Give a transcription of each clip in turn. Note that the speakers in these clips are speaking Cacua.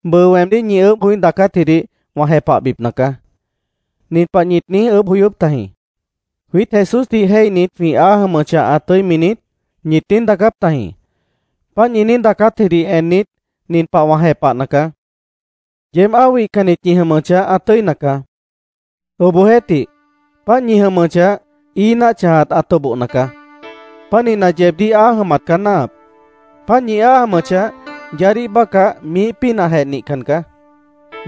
Bʉʉ weemdíh ñi ʉʉ́bh joí daacátjidih wã jepahbipna caá. Nin pah ñit niíj ʉʉ́bh joyóp tajĩ: “¿Jwiít Jesúsdih jéihnit jwĩ áa jʉmʉchah, ã tʉ́imi niít?” ñit niíj daacáp tajĩ. Páant ñi niíj daacátjidih ennit, nin pah wã jepahna caá: Yeéb áa wihcannit ñi jʉmʉchah, ã tʉ́ina caá. Obohjeéhtih, páant ñi jʉmʉchah, ií náah chãjat ã tobohna caá. Pánihna, yeebdíh áa jʉmat caá náahap. Páant ñi áa jʉmʉchah, yaádíh bácah miíh pínahjeh nihcan caá.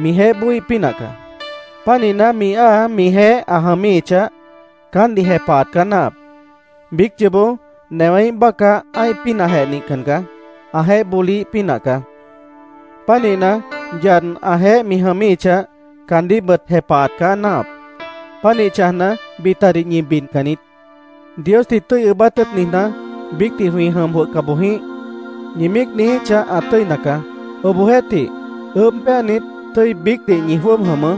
Mijeéh bóoíh pínah caá. Pánihna, mi áa mijeéh ã jʉmíhichah, caántdih jepahat caá náahap. Biíc yoobó newéíh bácah ã́ih pínahjeh nihcan caá. Ãjeéh bóliíh pínah caá. Pánihna, yad ãjeéh mi jʉmíhichah, caandíhbʉt jepahat caá náahap. Pánih chãjna, bitadih ñi bidcan niít. “Diosdih tʉ́i ʉʉ́bát tʉ́ʉt niijná, biícdih jwĩ jʉm jwʉhca boj jĩíh”, ñi míic niijíchah, ã tʉ́ina caá. Obohjeéhtih, ʉʉ́bh péanit, tʉ́i biícdih ñi jwʉ́ʉb jʉmʉʉ́.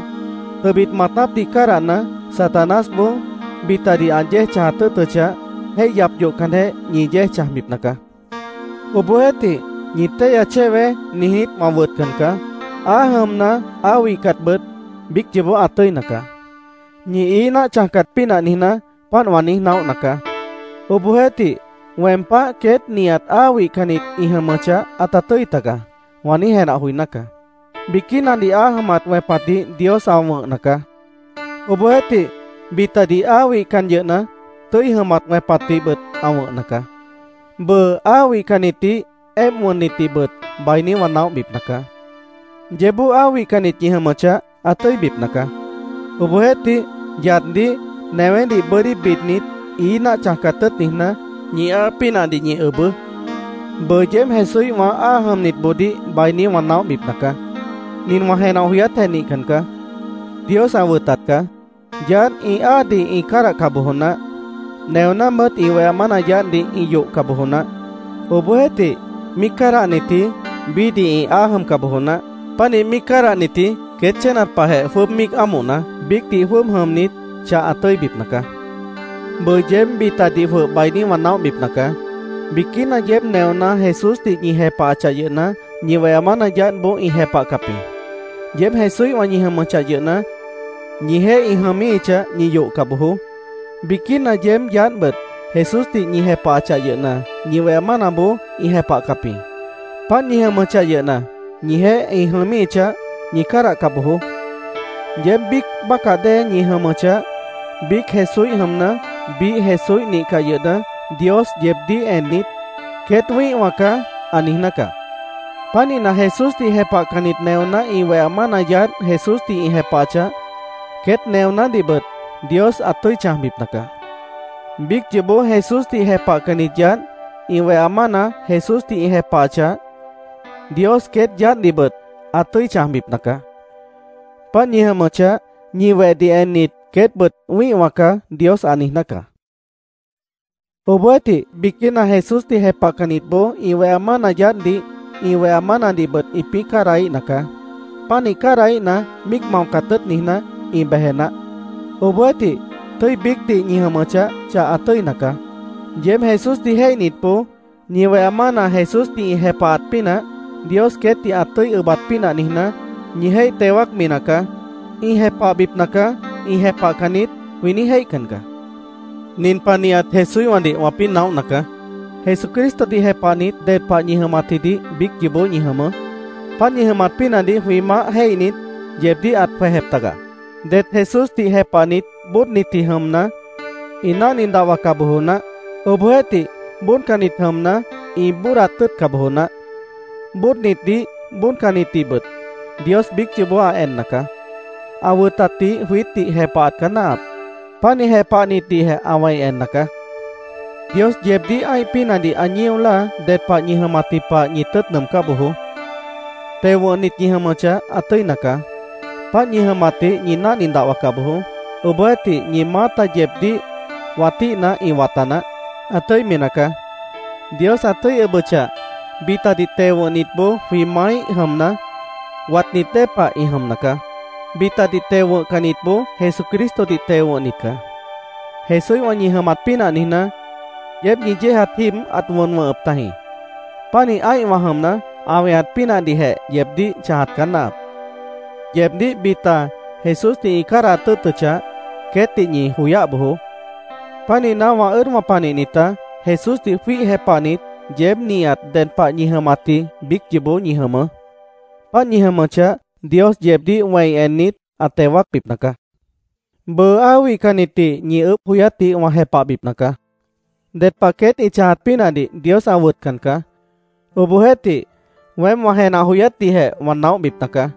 Tʉbit maatápdih cádahna, Satanásboó bitadih ã yéej chãjat tʉ́ʉtʉchah, jéih yap yohcanjeh, ñi yéej chãjbipna caá. Obohjeéhtih, “Ñi téihya chéweé”, niijnít, wã wʉtcan caá. Áa jʉmna, áa wihcatbʉt, biíc yoobó ã tʉ́ina caá. Ñi ií náah chãjcat pínah niijná, páant wã niíj naóhna caá. Obohjeéhtih, “Weem páh queét nihat áa wihcannit ĩ jʉmʉchah, ãta tʉ́i tagaá”, wã niíj jenah joiná caá. Biquínadih áa jʉmat wẽpatdih Dios ã wʉ̃hna caá. Obohjeéhtih, bitadih áa wihcan yʉhna, tʉ́i jʉmat wẽpatdihbʉt ã wʉ̃hna caá. Bʉʉ, áa wihcannitdih, éemp wʉnnitdihbʉt bainí wã naóhbipna caá. Yeébboó áa wihcannit ñi jʉmʉchah, ã tʉ́ibipna caá. Obohjeéhtih, yaddih, newédih bʉ́dí bidnit, ií náah chãjcat tʉ́ʉt niijná, ñi áa pínahdih ñi ʉbʉʉ́. Bʉʉ, yeéb Jesúíhwã áa jʉmnitboodíh bainí wã naóhbipna caá. Nin wã jenah joyátjeh nihcan caá. Dios ã wʉtat caá. Yaádh ĩ áadih ĩ cádahca bojo naáh. Neonábʉt ĩ weha mána yaádhdih ĩ yohca bojo naáh. Obohjeéhtih, míic cádahnitji, biíhdih ĩ áa jʉmca bojo naáh. Pánih míic cádahnitji queét chénat pahjeh jwʉ́ʉb míic ámohna, biícdih jwʉ́ʉb jʉmnit, chah ã tʉ́ibipna caá. Bʉʉ, yeéb bitadih jwʉh bainí wã naóhbipna caá. Biquína yeéb neoná Jesúsdih ñi jepahachah yʉhna, ñi weha mána yaádhboó ĩ jepahcap jĩ. Yeéb Jesúíhwã ñi jʉmʉchah yʉhna, ñijeéh ĩ jʉmíhichah, ñi yohca bojoó. Biquína yeéb yaádhbʉt Jesúsdih ñi jepahachah yʉhna, ñi weha mánaboó ĩ jepahcap jĩ. Páant ñi jʉmʉchah yʉhna, ñijeéh ĩ jʉmíhichah, ñi cádahca bojoó. Yeéb biíc bácah dée ñi jʉmʉchah, biíc Jesúíh jʉmna, biíh Jesúíh nihcah yʉhna, Dios yeebdíh ennit, “Queét wĩ́ihwã caá”, ã niijná caá. Pánihna, Jesúsdih jepahcannit neoná ĩ weha mána yaádh Jesúsdih ĩ jepahachah, queét neonádihbʉt Dios ã tʉ́i chãjbipna caá. Biíc yoobó Jesúsdih jepahcannit yaádh ĩ weha mána Jesúsdih ĩ jepahachah, Dios queét yaádhdihbʉt ã tʉ́i chãjbipna caá. Páant ñi jʉmʉchah, ñi wehdih ennit, “Queétbʉt wĩ́ihwã caá”, Dios ã niijná caá. Obohjeéhtih biquína Jesúsdih jepahcannitboó ĩ weha mána yaádhdih, ĩ weha mánadihbʉt ĩpĩ́ cádahíhna caá. Pánih cádahíhna, míic maocat tʉ́ʉt niijná, ĩ beje naáh. Obohjeéhtih, tʉ́i biícdih ñi jʉmʉchah, chah ã tʉ́ina caá. Yeéb Jesúsdih jéihnitboó ñi weha mána Jesúsdih ĩ jepahat pínah, Dios queétdih ã tʉ́i ʉbat pínah niijná, ñi jéih teo wáacmi nacaá. “Ĩ jepahbipna caá. Ĩ jepahcan niít”, jwĩ niíj jéihcan caá. Nin pah nihat Jesúíhwãdih wãpĩ́ naóhna caá: Jesucristodih jepahnit, ded pah ñi jʉmatjidih biíc yoobó ñi jʉmʉʉ́. Páant ñi jʉmat pínahdih jwĩ Maáh jéihnit, yeebdíh ãt jwejep taga. Det Jesúsdih jepahnit bóodnitji jʉmna, ĩ náhni dahwaca bojo naáh. Obohjeéhtih, bóodcannit jʉmna, ĩ bóodat tʉ́ʉtca bojo naáh. Bóodnitdih, bóodcannitdihbʉt Dios biíc yoobó ã enna caá. Ã wʉtatdih jwiítdih jepahat caá náahap. Pánih jepahnitdihjeh ã wẽi enna caá. Dios yeebdíh ã́ih pínahdih ã ñío láa ded pah ñi jʉmatji pah ñi tʉ́ʉt nʉʉmcá bojoó. Teo wʉ̃hnit ñi jʉmʉchah, ã tʉ́ina caá. Páant ñi jʉmatdih ñi náhni dahwaca bojoó. Obohjeéhtih, ñi maáta yeebdíh watíhna, ĩ wata naáh. Ã tʉ́imi nacaá. Dios ã tʉ́i ʉbʉchah, bitadih teo wʉ̃hnitboó jwĩ maáíh jʉmna, watnit dée pah ĩ jʉmna caá. Bitadih teo wʉ̃hcannitboó Jesucristodih teo wʉ̃hnit caá. Jesúíhwã ñi jʉmat pínah niijná, yeéb ñi yéejat jíib ãt wʉn wʉ̃hʉp tajĩ. Pánih ã́ihwã jʉmna, ã weñat pínahdihjeh yeebdíh chãjat caá náahap. Yeebdíh bita Jesúsdih ĩ cádahat tʉ́ʉtʉchah, queétdih ñi joyáh bojoó. Pánihna, wã ʉ́ʉdwã panihnitá, Jesúsdih jwíih jepahnit, yeéb nihat ded pah ñi jʉmatji biíc yoobó ñi jʉmʉʉ́. Páant ñi jʉmʉchah, Dios yeebdíh wẽi ennit, ã teo wáacbipna caá. Bʉʉ, áa wihcannitdih ñi ʉʉ́bh joyátdih wã jepahbipna caá. Ded pah queét ĩ chãjat pínahdih Dios ã wʉtcan caá. Obohjeéhtih, weém wã jenah joyátdihjeh wã naóhbipna caá.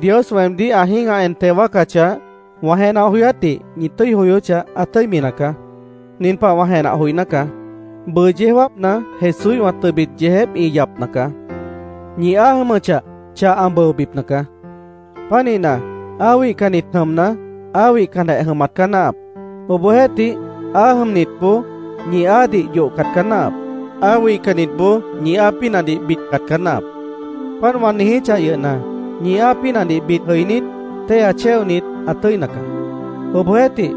Dios weemdíh ã jĩ́gah en teo wáacachah, wã jenah joyátdih ñi tʉ́i joyóchah, ã tʉ́imi nacaá. Nin pah wã jenah joiná caá: Bʉʉ yeó jáapna Jesúíhwã tʉbit yeejép ĩ yapna caá. Ñi áa jʉmʉchah, chah ã bʉobipna caá. Pánihna, áa wihcannit jʉmna, áa wihcanjeh jʉmat caá náahap. Obohjeéhtih, áa jʉmnitboó ñi áadih yohcat caá náahap. Áa wihcannitboó ñi áa pínahdih bidcat caá náahap. Páant wã niijíchah yʉhna, ñi áa pínahdih bid jʉinít, téihya chéonit, ã tʉ́ina caá. Obohjeéhtih,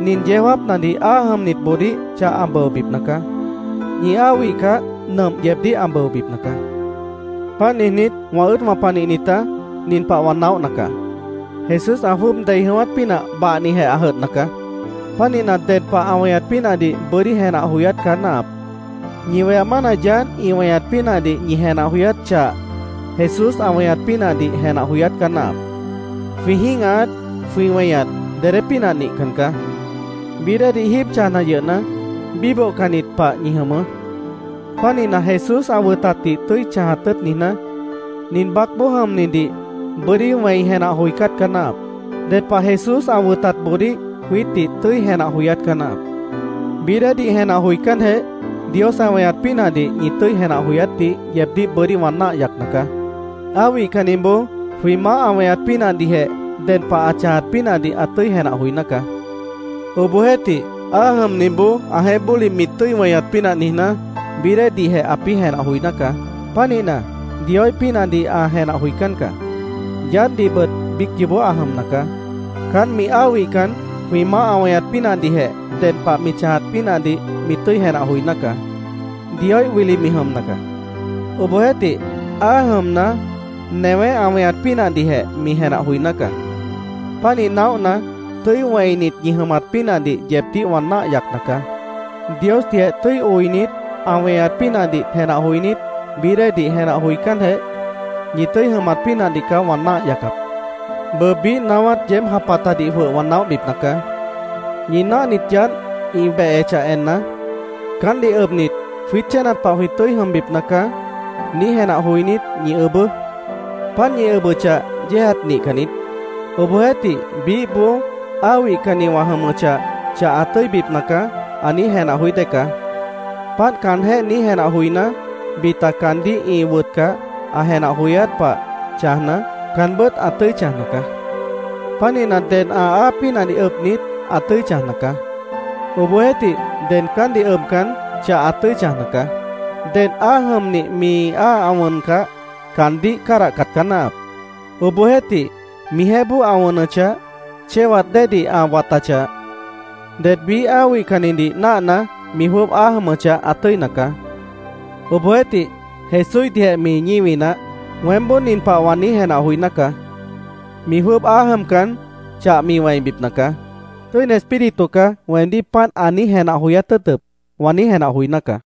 nin yeó jáapnadih áa jʉmnitboodíh chah ã bʉobipna caá. Ñi áa wihcah, nʉmp yeebdíh ã bʉobipna caá. Páant niijnít, wã ʉ́ʉdwã panihnitá, nin pah wã naóhna caá: Jesús ã jwʉ́ʉb dei jʉ̃ʉ́wát pínah bahnijeh ã jʉdhna caá. Pánihna, ded pah ã weñat pínahdih bʉ́dí jenah joyát caá náahap. Ñi weha mána yaádh ĩ weñat pínahdih ñi jenah joyát chah, Jesús ã weñat pínahdih jenah joyát caá náahap. Jwĩ jĩ́gahat, jwĩ weñat, dedé pínah nihcan caá. Bií déedih jíib chãjna yʉhna, bíbohcannit pah ñi jʉmʉʉ́. Pánihna, Jesús ã wʉtatdih tʉ́i chãjat tʉ́ʉt niijná, nin baácboó jʉmnidih bʉ́dí wẽi jenah joicát caá náahap. Ded pah Jesús ã wʉtatboodíh jwiítdih tʉ́i jenah joyát caá náahap. Bií déedih jenah joicánjeh, Dios ã weñat pínahdih ñi tʉ́i jenah joyátdih yeebdíh bʉ́dí wã náah yacna caá. Áa wihcanniboó jwĩ Maáh ã weñat pínahdihjeh ded pah ã chãjat pínahdih ã tʉ́i jenah joiná caá. Obohjeéhtih, áa jʉmniboó ãjeéh bóli mi tʉ́i weñat pínah niijná, bií déedihjeh ãpĩ́ jenah joiná caá. Pánihna, Dioíh pínahdih ã jenah joicán caá. Yaádhdihbʉt biíc yoobó ã jʉmna caá. Caánt mi áa wihcan, jwĩ Maáh ã weñat pínahdihjeh ded pah mi chãjat pínahdih mi tʉ́i jenah joiná caá. Dioíh wili mi jʉmna caá. Obohjeéhtih, áa jʉmna, newé ã weñat pínahdihjeh mi jenah joiná caá. Pánih naóhna, tʉ́i wẽinit ñi jʉmat pínahdih yeebdíh wã náah yacna caá. Diosdihjeh tʉ́i oinit, ã weñat pínahdih jenah joinít, bií déedih jenah joicánjeh, ñi tʉ́i jʉmat pínahdih caá wã náah yacap. Bʉʉ, biíh naáwát yeéb japatadih jwʉh wã naóhbipna caá. Ñi náahnit yaádh ĩ behechah enna, “Caántdih ʉbnit, jwiít chénat pah jwĩ tʉ́i jʉmbipna caá”, niíj jenah joinít, ñi ʉbʉʉ́. Páant ñi ʉbʉchah, yéejat nihcan niít. Obohjeéhtih, biíhboó “Áa wihcanni wã jʉmʉchah, chah ã tʉ́ibipna caá”, ã niíj jenah joí dée caá. Páant caanjéh niíj jenah joiná, bita caandíh ĩ wʉtcah, ã jenah joyát pah chãjna, caanbʉ́t ã tʉ́i chãjna caá. Pánihna, ded ã áa pínahdih ʉbnit, ã tʉ́i chãjna caá. Obohjeéhtih, ded caántdih ʉbcan, chah ã tʉ́i chãjna caá. Dedh áa jʉmnih, mi áa ã wʉncah, caandíh cádahcat caá náahap. Obohjeéhtih, mijeéh bóo ã wʉnʉchah, chéwat déedih ã watachah, ded biíh áa wihcannidih náahna, mi jwʉ́ʉb áa jʉmʉchah, ã tʉ́ina caá. Obohjeéhtih, Jesúíhdihjeh mi ñíwi naáh. Weémboó nin pah wã niíj jenah joiná caá: “Mi jwʉ́ʉb áa jʉmcan, chah mi wẽibipna caá. Tʉ́ini Espíritu caá weemdíh páant ã niíj jenah joyát tʉ́ʉtʉp be”, wã niíj jenah joiná caá.